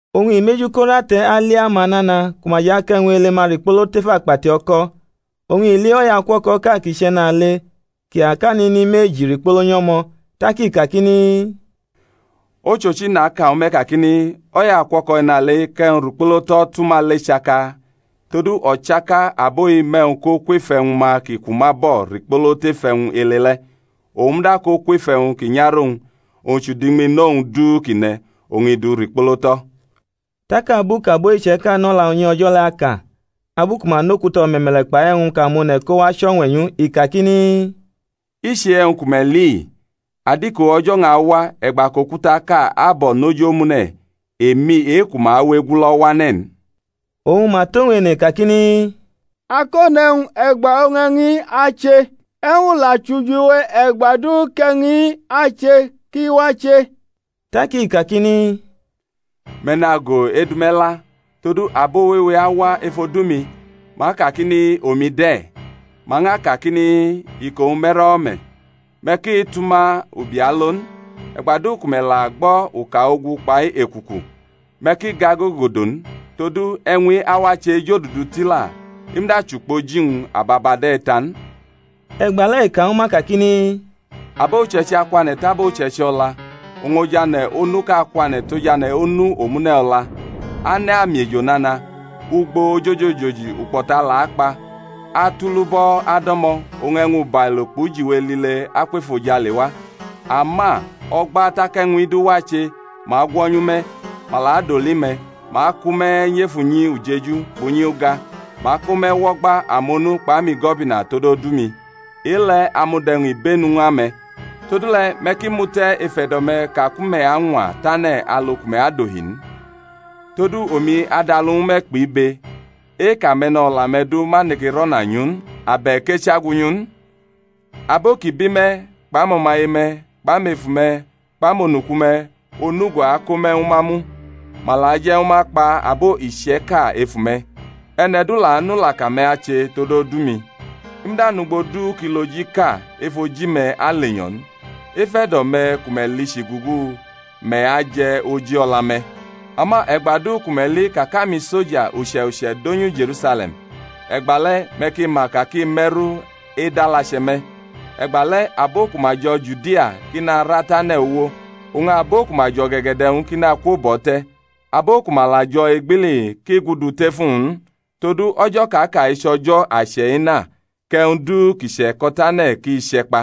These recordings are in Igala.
Oñ i mʼeju ko rʼate̩ ali amanana ku ma jʼakʼe̩wñ ele-ma rikpolo tef akpati o̩ko̩. Oñ i li o̩yaukuo̩ko̩ʼka kʼi chʼe̩nale kʼi akʼanini meji rikpolo nyʼo̩mo̩. Tak i kakini, Ochochi, naka ñwu me̩ kakini, O̩yaukuo̩ko̩ e̩nale-i kʼe̩wñ rikpolo tʼo̩ tʼuma le chaka: todu o̩chaka abo-i mʼe̩wñ ko kwef e̩wñ-ma ki ku ma bo̩ rikpolo tef e̩wñ ele le̩; owñ muda ko kwef e̩wñ ki nyarʼowñ, owñ chʼudiñmino-wñ du kʼi ne̩, oñ i du rikpolo tʼo̩. Tak abu kʼabo iche̩ka nʼo̩la unyi O̩jo̩ le̩ aka, alu ku ma nʼokuta o̩me̩me̩le̩ kpai e̩wñ kʼamone̩ kowa chʼo̩ñwe̩ nyʼu, i kakini, I chʼe-e̩wñ ku me̩ li-i, adiko o̩jo̩-wñ awa e̩gba kʼokutaʼka abo̩ nʼoji omune̩ emi e-ku ma awe egulo̩ wane̩ n. Oñ ma tʼowñ ene kakini, Akone̩wñ, e̩gba oñ e̩wñ-i ache? E̩wñ la chʼujiwe e̩gba du kʼe̩wñ-i ache ki wache? Tak i kakini, Me̩ nago edʼume̩ la, todu abo wewe awa ef odu-mi, ma akakini, Omi de̩; ma ñʼaka kakini, Iko-wñ me̩ro̩wo̩ me̩: me̩ ki tʼuma ubi alo n. E̩gba du ku me̩ la gbo̩ uka ogu kpai ekuku, me̩ ki gagogodo n; todu e̩wñ-i awache ejodudu tila; i muda chʼukpoji-wñ ababa de̩ ta n. E̩gbale̩ i ka ñw ma kakini, Abo uche̩ichi akwane̩ tʼabo uche̩ichi o̩la, oñ ojane̩ onuʼka akwane̩ tʼojane̩ onu omune̩ o̩la; ane̩ amiejo nana, ugbo ojoji ojoji ukpo̩ta la akpa, atulubo̩ ado̩mo̩; oñ e̩wñ ubailo kpʼujiwe lile akwʼefojale wa. Ama o̩gba tak e̩wñ-i du wache ma agwo̩nyu me̩, ma la adoli me̩, ma akʼume̩ nyʼef unyi ujeju kpʼunyi uga, ma ako me̩ wʼo̩gba amonu kpʼamigo̩bina tod odu-mi. E-le̩ amud e̩wñ ibenu ñw ame̩. Todule̩ me̩ ki mute̩ ef e̩do̩-me̩ ka ku me̩ añwa tane̩ alu ku me̩ adohi n. Todu omi adʼalu ñwu me̩ kpʼibe, e-kʼame̩no̩la-me̩ du ma neke rʼo̩na nyʼu n, abe̩k echagwunyu n. Abo ki bi me̩ kpʼamo̩maye-me̩ kpʼamefu-me̩ kpʼamonuku-me̩ onugo ako me̩ ñwu ma mu; ma la aje̩ ñwu ma kpa abo iche̩ka ef ume̩. E̩ne̩ du la anʼulaka-me̩ ache tod odu-mi. I muda nʼugbo du kʼilojiʼka ef oji-me̩ alenyo̩ n. Ef e̩do̩-me̩ ku me̩ lichi gugu, me̩ aje̩ oji o̩la-me̩. Ama e̩gba du ku me̩ li ka kʼamisoja uche̩uche̩ donyu Je̩rusale̩m, e̩gbale̩ me̩ ki ma ka kʼi me̩ru edʼalache̩ me̩. E̩gbale̩ abo ku ma jo̩ Judia ki nara tʼane̩ uwo; oñ abo ku ma jʼo̩ge̩ge̩de̩-wñ ki nakwo bʼo̩ te̩; abo ku ma la jo̩ egbili ki gudu tʼef uwñ n. Todu o̩jo̩ kʼa ka-i chʼo̩jo̩ ache̩ ena, kʼe̩wñ du ki che̩ko̩tane̩ ki che̩kpa.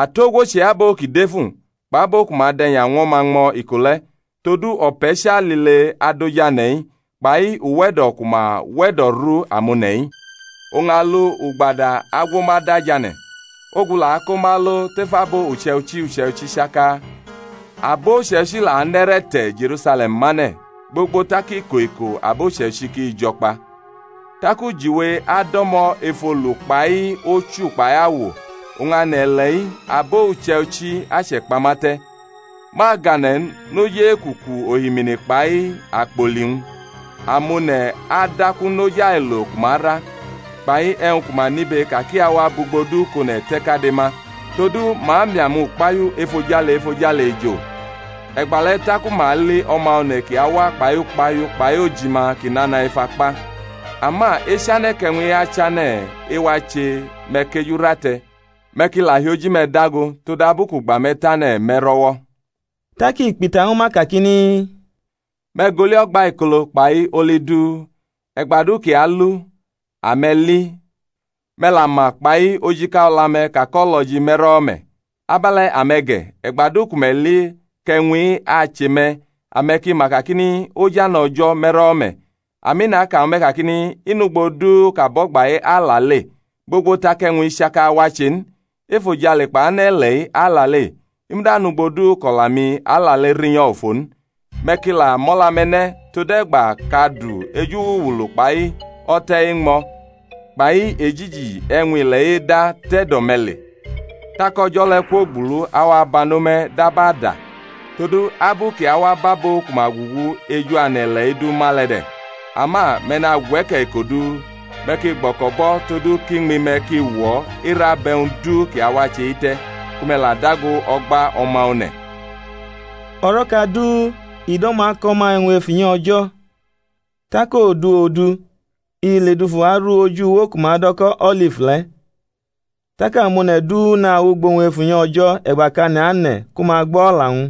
Atogwo chʼe-abo ki defu, kpʼabo ku ma dʼe̩nya ñw o̩ma ñmo̩ iko le̩, todu o̩pe̩cha lile adʼoj ane̩-i, kpai uwe̩do̩ ku ma we̩do̩ru amone̩-i. Oñ alu ugbadu agwo ma da jane̩, ogu la ako ma alo tʼef abo uche̩ichi uche̩ichi chaka. Abo uche̩ichi la anʼe̩re̩ te̩ Je̩rusale̩m mane̩ gbogbo tak iko iko abo uche̩ichi ki jo̩ kpa. Tak ujiwe ado̩mo̩ ef olu kpai ochu kpai awo; oñ ane̩-ile̩-i abo uche̩ichi ache̩kpama te̩, ma agane̩ n noj ekuku ohimini kpai akpoli-wñ; amone̩ adaku noj ailo ku ma ra, kpai e̩wñ ku ma nibe ka kʼi awa bʼugbo du kʼone̩ te̩ kade ma. Todu ma miʼamukpahiu efojale efojale ejo. E̩gbale̩ taku ma ali O̩ma One̩ kʼi awa kpai ukpahiu kpai ojima ki nana ef akpa. Ama echane̩ kʼe̩wñ-i achane̩ ewache, me̩ kʼeju rʼate̩, me̩ ki la hi oji-me̩ dago; todabu kʼugba me̩ tane̩ me̩ro̩-wo̩. Tak i kpʼita ñwu ma, kakini, Me̩ gʼoli o̩gbaikolo, kpai oli du: e̩gba du kʼi alu, ame̩ li, me̩ la ma kpai ojika o̩la-me̩ ka kʼo̩lo̩ji me̩ro̩wo̩ me̩. Abe̩le̩ ame̩ ge̩, e̩gba du ku me̩ li kʼe̩wñ-i ache me̩, ame̩ ki ma kakini, Ojane̩ O̩jo̩ me̩ro̩wo̩ me̩. Ami, naka ñwu me̩, kakini, I nʼugbo du kʼabo̩gba-i alale, gbogbo tak e̩wñ-i chaka wache n. Efojale kpai ane̩-ile̩-i alale; i muda nʼugbo du kʼo̩la-mi alale rinyo̩ ofo n. Me̩ ki la mʼo̩la-me̩ ne̩, tode̩gba kʼadu eju-wuluwulu kpai o̩te̩ eñmo̩ kpai ejiji e̩wñ-ile̩-i eda tʼe̩do̩ me̩ le, tak o̩jo̩ le̩ kwogbulu awa bano me̩ dab ada: todu abu kʼi awa bʼabo ku ma gugu eju ane̩-ile̩-i du ma le̩ de̩. Ama me̩ nagwe̩ke̩ iko du, me̩ ki gbo̩ko̩bʼo̩ todu kʼiñmi-me̩ ki wo era bʼe̩wñ du kʼi awache-i te̩, ku me̩ la dago o̩gba O̩ma One̩. O̩ro̩ka du i do̩mo̩ ako̩ ma e̩wñ ef unyi O̩jo̩; tak odu odu i ledufu aru oj uwo ku ma do̩ ko̩ O̩lif le̩. Tak amone̩ du nawʼugbo-wñ ef unyi O̩jo̩ e̩gba kʼane̩ ane̩ ku ma gbo o̩la-wñ.